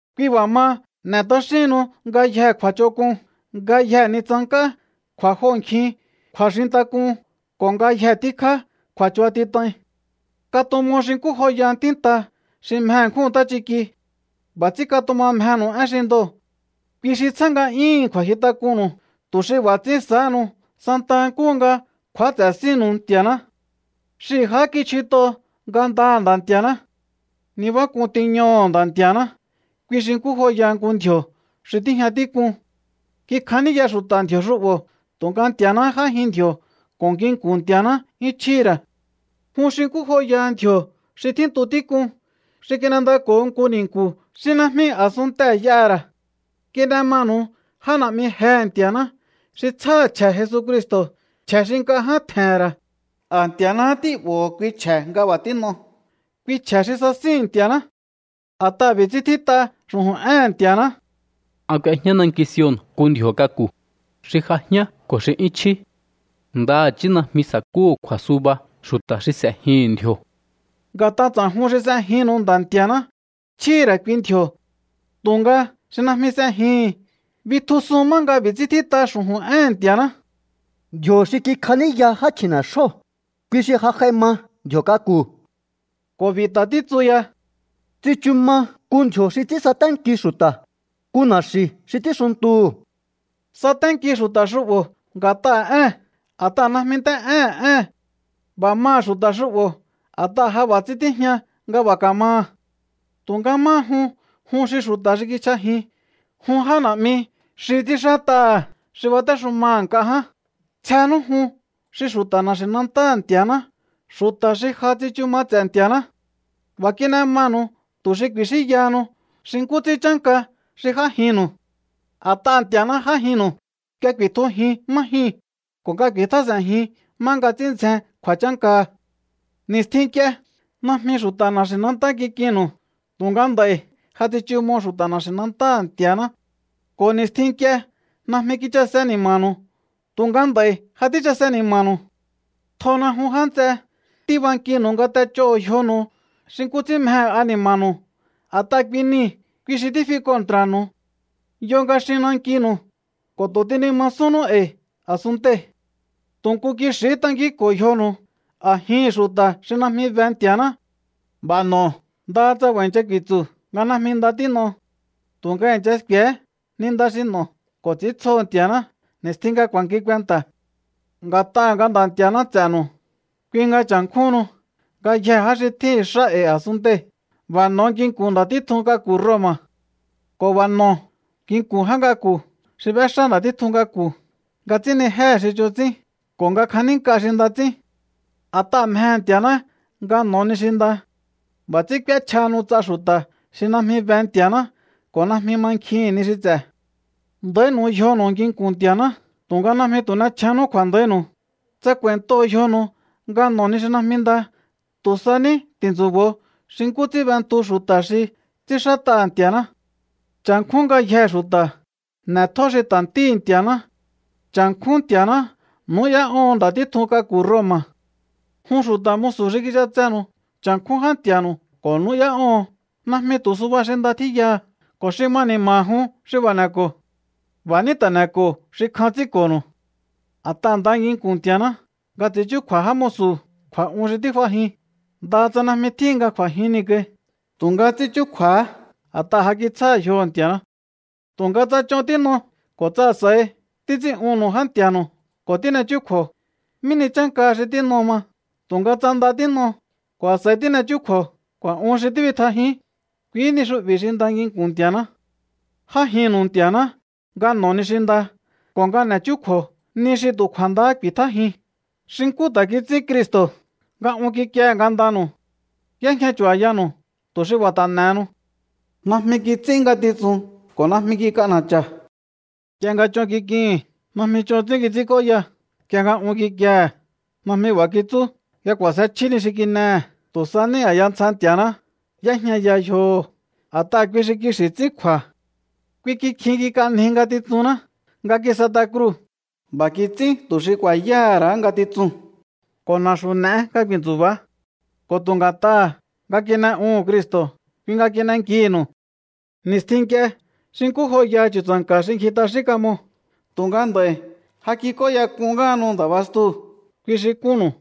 Kui b'a̱ maha, n'e̱ t'axíhinnu ngayje kju̱a̱ch'onk'un, ngayje ni tsank'á, kju̱a̱joho̱nkjin, kju̱a̱xintak'un ko̱ ngayje tíkjá kju̱a̱chubatit'ain. Katumo xi nkú joyaha ntínta xi mje ṉkjúhu̱n ntáchiki. B'a̱ ts'ín katuma mjenu̱u én xi ndoo̱. Kui xi tsjá nga'yúhu̱n kju̱a̱nkjintak'unnu̱u, tu̱ xi b'a̱ ts'ín sa̱áhanu santaha nkúhu nga kju̱áts'e̱ sínnu̱u Nti̱a̱ná. Xihi̱ jahá kichjut'o ngandaha̱ Nda̱ Nti̱a̱ná. Nibák'un tiñoho̱o Nda̱ Nti̱a̱ná, kui xi nkú joyaha nku ndji̱o̱ xi tíjña tík'un. Kikjaníya xu̱ta̱ ndji̱o̱ xu'bo̱, tu̱nga Nti̱a̱náhá j'ájin ndji̱o̱ ko̱ nginku̱n Nti̱a̱ná 'yún chjíhi̱ ra̱. Jun xi nkú joyaha ndji̱o̱ xi tjíntu tík'un, xi kin'endako̱ho nku ni̱nku̱ xi najmi a̱sunntee̱ y'aha̱ ra̱. Kin'e manu̱u já na̱'mi jehe̱ Nti̱a̱ná xi tsjáha̱ chje̱ Jesucristo̱, chje̱ xi nk'a ján tje̱he̱n ra̱. A̱ Nti̱a̱náhá tí'bo̱ho̱ kui chje̱ nga b'a̱ tín'o, kui chje̱ xi sasíhi̱n Nti̱a̱ná. A̱t'aha̱ b'i̱ ts'ín tjít'a xu̱ju̱n éhe̱n Nti̱a̱ná: An k'uejñá nanki Sion nku ndji̱o̱ k'aku̱, xi j'ajián ko̱ xi 'yún chjí. Ndaha̱chí najmi sa̱kúhu̱ kju̱a̱suba xu̱ta̱ xi s'e̱jihi̱n ndji̱o̱. Nga̱t'a ts'a̱jun xi s'ejinnu̱u Nda̱ Nti̱a̱ná, chjíhi̱ ra̱ kui ndji̱o̱. Tu̱nga xi najmi s'ejihi̱n, bitjusun má nga b'i̱ ts'ín tjít'a xu̱ju̱n éhe̱n Nti̱a̱ná: Ndji̱o̱ xi kikjaníya já chji̱ne̱xjóo̱, kui xi ja j'ai ma ndji̱o̱ k'aku̱. Ko̱ b'i̱ ta̱ títsu ya: Tsichu ma nku ndji̱o̱ xi ts'ín saténki xu̱ta̱, nku na̱xi̱ xi ts'ínxuntuhu̱. Saténki xu̱ta̱ xu'bo̱ nga̱t'aha̱ ée̱n, a̱t'aha̱ najmi nt'é'éhe̱n ée̱n. B'a̱ maha̱ xu̱ta̱ xu'bo̱ a̱t'aha̱ ja b'a̱ ts'ín tíjña nga b'a̱ ka̱maha̱. Tu̱nga máha jun, jun xi xu̱ta̱ xi kichj'ajin, jun já na̱'mi xi ts'ínxát'aha̱ xi batéxumaha̱ nk'a ján, tsjenú jun xi xu̱ta̱ na̱xi̱nantáha̱ Nti̱a̱ná, xu̱ta̱ xi ja tsichu ma ts'e̱ Nti̱a̱ná. B'a̱ kin'e manu̱u tu̱ xi ku̱i̱xínyahanu xi nkú ts'ín chánka xi j'ájinnu̱u. A̱t'aha̱ Nti̱a̱ná j'ájinnu̱u nga ku̱i̱tjujiun má jyuu̱n ko̱ nga ku̱i̱tjás'e̱njiun má nga ts'ín ndzjen kju̱a̱chánkaha̱. Ni̱stjin nk'ie, najmi xu̱ta̱ na̱xi̱nantá kik'innu̱u, tu̱nga nd'a̱i̱ ja tsichumo xu̱ta̱ na̱xi̱nantáha̱ Nti̱a̱ná. Ko̱ ni̱stjin nk'ie najmi kichase ni̱ma̱nu̱u, tu̱nga nd'a̱i̱ ja tíchase ni̱ma̱nu̱u. Tjona jun, já nts'e. Tíbankinu̱u nga t'ech'óho̱o yjonu̱u xi nkú ts'ín mjehe̱ ani̱ma̱nu̱u. A̱t'aha̱ kui nii̱, kui xi tífi kontra̱nu̱u. Yo nga xin nankinu̱u ko̱ tu̱ tínimasúnnú e̱i̱ a̱sunntei̱. Tu̱ nku kixi̱hí tankínko̱o yjonu̱u a̱jihi̱n xu̱ta̱ xi najmi be Nti̱a̱ná. B'a̱ n'o̱o ndaha tsa b'a̱ i̱ncha ku̱i̱tsu̱ nga najmi nda tín'o. Tu̱nga i̱ncha sku̱e̱hé ni nda xi n'o̱o ko̱ ts'i̱íntsjoho̱ Nti̱a̱ná ni̱stjin nga ku̱a̱nki kuenta̱. Nga̱t'aha̱ nga Nda̱ Nti̱a̱ná ts'e̱nu̱u, kui nga cha̱nkjúhunnu ngayjee̱ já xi tjíhi̱n xá e̱i̱ a̱sunntei̱. B'a̱ n'o̱o nginku̱n nda̱ títjun k'aku̱ Roma̱ ko̱ b'a̱ n'o̱o nginku̱n já k'aku̱ xi b'éxá nda̱ títjun k'aku̱ nga ts'ínnijéhe̱ xi ch'on ts'ín ko̱ nga kja̱nínk'a xi nda ts'ín. A̱t'aha̱ mjehe̱ Nti̱a̱ná nga n'o̱o ni xi nda. B'a̱ ts'ín k'úéchjahanu ts'a xu̱ta̱ xi najmi be Nti̱a̱ná ko̱ najmi mankjihi̱n ni xi ts'e̱. Nda̱ínu̱u yjonu̱u nginku̱n Nti̱a̱ná, tu̱nga najmi tu̱ n'echjénnú kju̱a̱nda̱ínu̱u tsa k'u̱a̱i̱ntoho̱o yjonu̱u nga n'o̱o ni xi najmi nda. Tu̱ sa ní ti̱ntsu̱bo̱o xi nkú ts'ín b'entu xu̱ta̱ xi ts'ínxát'aha̱ Nti̱a̱ná. Cha̱nkjún ngayjee̱ xu̱ta̱. N'e̱tjó xi ta̱ Ntíhi̱ Nti̱a̱ná. Cha̱nkjún Nti̱a̱ná. Nu̱ú'yá'óho̱on nda̱ títjun k'aku̱ Roma̱. Jun xu̱ta̱ musu̱ xi kich'atsenu̱u, cha̱nkjún já nti̱a̱nu̱u ko̱ nu̱ú'yá'óho̱on, najmi tu̱ suba xi nda tjíyaha̱ ko̱ xi ma ni̱ma̱ha̱ jun xi b'a̱ n'e̱ko̱o. B'a̱ ní ta̱ n'e̱ko̱o xi kjan ts'ínko̱nu̱u. A̱t'aha̱ nda nginku̱n Nti̱a̱ná nga ts'i̱ín chúkju̱a̱ jámu̱su̱ kju̱a̱'un xi tíf'ajin, ndaha tsa najmi tjíhin nga kj'u̱a̱jin niu̱ kai, tu̱nga ts'ín chúkju̱a̱há a̱t'aha̱ ja kitsjáha̱ yjoho̱ Nti̱a̱ná. Tu̱nga tsa ch'on tín'o ko̱ tsa a̱s'a̱i títs'ín'unnu̱u já nti̱a̱nu̱u ko̱ tín'echjúkju̱o, ¿mí ni chánkaha xi tín'o ma? Tu̱nga tsa nda tín'o ko̱ a̱s'a̱i tín'e chúkju̱o kju̱a̱'un xi tíbitjajíún, kuihí ni xu'bi̱ xi nda nginku̱n Nti̱a̱ná. J'ájinnu̱u Nti̱a̱ná nga n'o̱o ni xi nda ko̱ nga n'e̱ chúkju̱o ni xi tu̱ kju̱a̱ndahá ku̱i̱tjájiun, xi nkú ta̱ kits'ín Cristo̱ nga un kikiehe̱ ngandanu̱u. Y'éjña chu̱ba̱yanu̱u, tu̱ xi b'a̱ ta̱ n'e̱henu. Najmi kits'ín ngatitsun ko̱ najmi kik'ana̱cha̱. Nk'ie nga ch'on kik'ihi̱n, najmi ch'on ts'ín kits'ínk'óya. Nk'ie nga un kikiehe̱, najmi b'a̱ kitsú nga k'u̱a̱sje chjí ni xi tín'ehe̱. Tu̱ sa ní a̱ya ntsja Nti̱a̱ná y'éjñaya yjoho̱, a̱t'aha̱ kui xi kixi̱ ts'ín kju̱a̱. Kui kikjin kik'anji ngatitsunná nga kis'et'a kruu̱. B'a̱ kits'ín tu̱ xi ku̱a̱yáha̱ ra̱á ngatitsuu̱n ko̱ na̱xu̱ n'e̱é nga ku̱i̱ntsu̱ba̱á. Ko̱ tu̱ nga̱t'aha̱ nga kin'e'uhu̱n Cristo̱, kui nga kin'enkihi̱nu̱u. Ni̱stjin nk'ie xi nkú joyaha chu̱tsa̱nka̱ xi ngji t'axín kamo, tu̱nga nd'a̱i̱ ja kik'óyak'un ngáhanu Nda̱ bastuu̱, kui xi kunnu̱u.